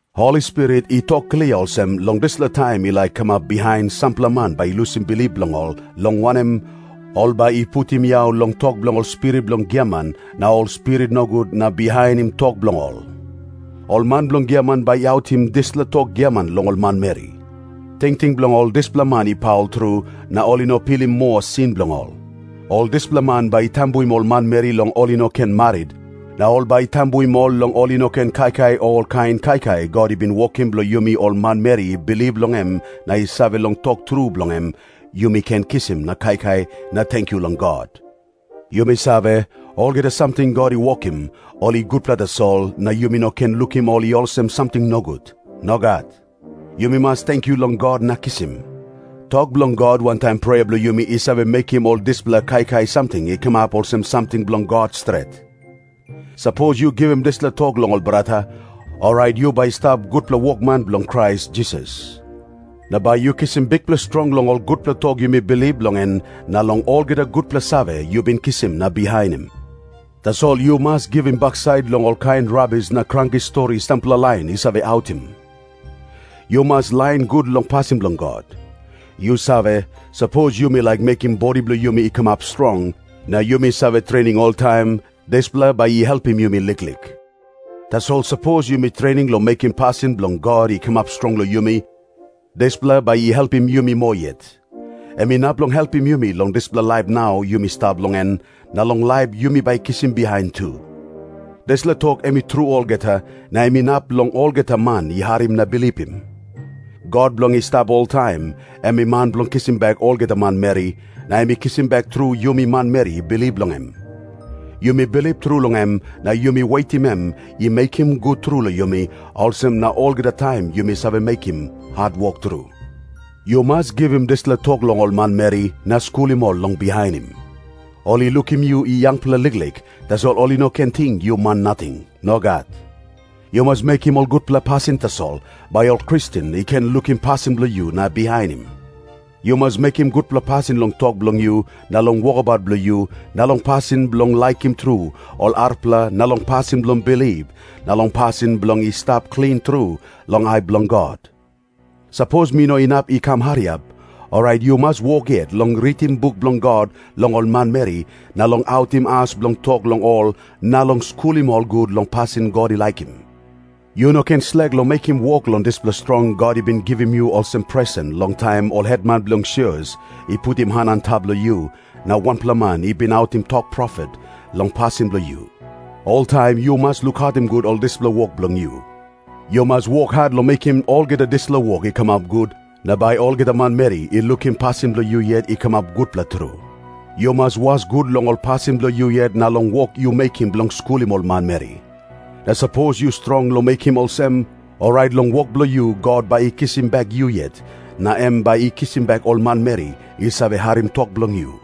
Holi Spirit i tok klia olsem, long dispela taim i laik kamap bihain sampela man bai i lusim bilip bilong ol, long wanem, ol bai i putim yau long tok bilong ol spirit bilong giaman na ol spirit nogut na bihainim tok bilong ol. Ol man bilong giaman bai i autim dispela tok giaman long ol manmeri. Tingting bilong ol dispela man i paul tru, na ol i no pilim moa sin bilong ol. Ol dispela man bai i tambuim ol manmeri long ol i no ken marit na ol bai i tambuim ol long ol i no ken kaikai olkain kaikai God i bin wokim bilong yumi ol manmeri i bilip long em na i save long tok tru bilong em, yumi ken kisim na kaikai na tenkyu long God. Yumi save, olgeta samting God i wokim, ol i gutpela tasol, na yumi no ken lukim ol i olsem samting nogut. Nogat. Yumi mas tenkyu long God na kisim. Tok bilong God wantaim prea bilong yumi i save mekim ol dispela kaikai samting i kamap olsem samting bilong God stret. Sapos yu givim dispela tok long ol brata, orait yu bai stap gutpela wokman bilong Krais Jisas. Na bai yu kisim bikpela strong long ol gutpela tok yumi bilip long en na long olgeta gutpela save yu bin kisim na bihainim. Tasol yu mas givim baksait long olkain rabis na kranki stori sampela lain i save autim. Yu mas lain gut long pasin bilong God. Yu save, sapos yumi laik mekim bodi bilong yumi i kamap strong, na yumi save trening oltaim, dispela bai i helpim yumi liklik. Tasol sapos yumi trening long mekim pasin bilong God i kamap strong long yumi, dispela bai i helpim yumi moa yet. Em inap long helpim yumi long dispela laip nau yumi stap long en, na long laip yumi bai kisim bihain tu. Dispela tok em i tru olgeta, na em inap long olgeta man i harim na bilipim. God bilong i stap oltaim, em i man bilong kisim bek olgeta manmeri, na em i kisim bek tru yumi manmeri i bilip long em. Yumi bilip tru long em na yumi wetim em i mekim gut tru long yumi, olsem na olgeta taim yumi save mekim hatwok tru. Yu mas givim dispela tok long ol manmeri, na skulim ol long bihainim. Ol i lukim yu i yangpela liklik, tasol ol i no ken ting yu man nating. Nogat. Yu mas mekim ol gutpela pasin tasol, bai ol Kristen i ken lukim pasin bilong yu na bihainim. Yu mas mekim gutpela pasin long tok bilong yu na long wokabaut bilong yu na long pasin bilong laikim tru ol arapela na long pasin bilong bilip na long pasin bilong i stap klin tru long ai bilong God. Sapos mi no inap i kam hariap, orait yu mas wok yet long ritim buk bilong God long ol manmeri na long autim as bilong tok long ol na long skulim ol gut long pasin God i laikim. Yu no ken slek long mekim wok long dispela strong God i bin givim yu olsem presen long taim ol hetman bilong sios i putim han antap long yu, na wanpela man i bin autim tok profet long pasin bilong yu. Oltaim yu mas lukautim gut ol dispela wok bilong yu. Yu mas wok hat long mekim olgeta dispela wok i kamap gut, na bai olgeta manmeri i lukim pasin bilong yu yet i kamap gutpela tru. Yu mas was gut long ol pasin bilong yu yet na long wok yu mekim bilong skulim ol manmeri. Na sapos yu strong long mekim olsem, orait long wok bilong yu God bai i kisim bek yu yet, na em bai i kisim bek ol manmeri i save harim tok bilong yu.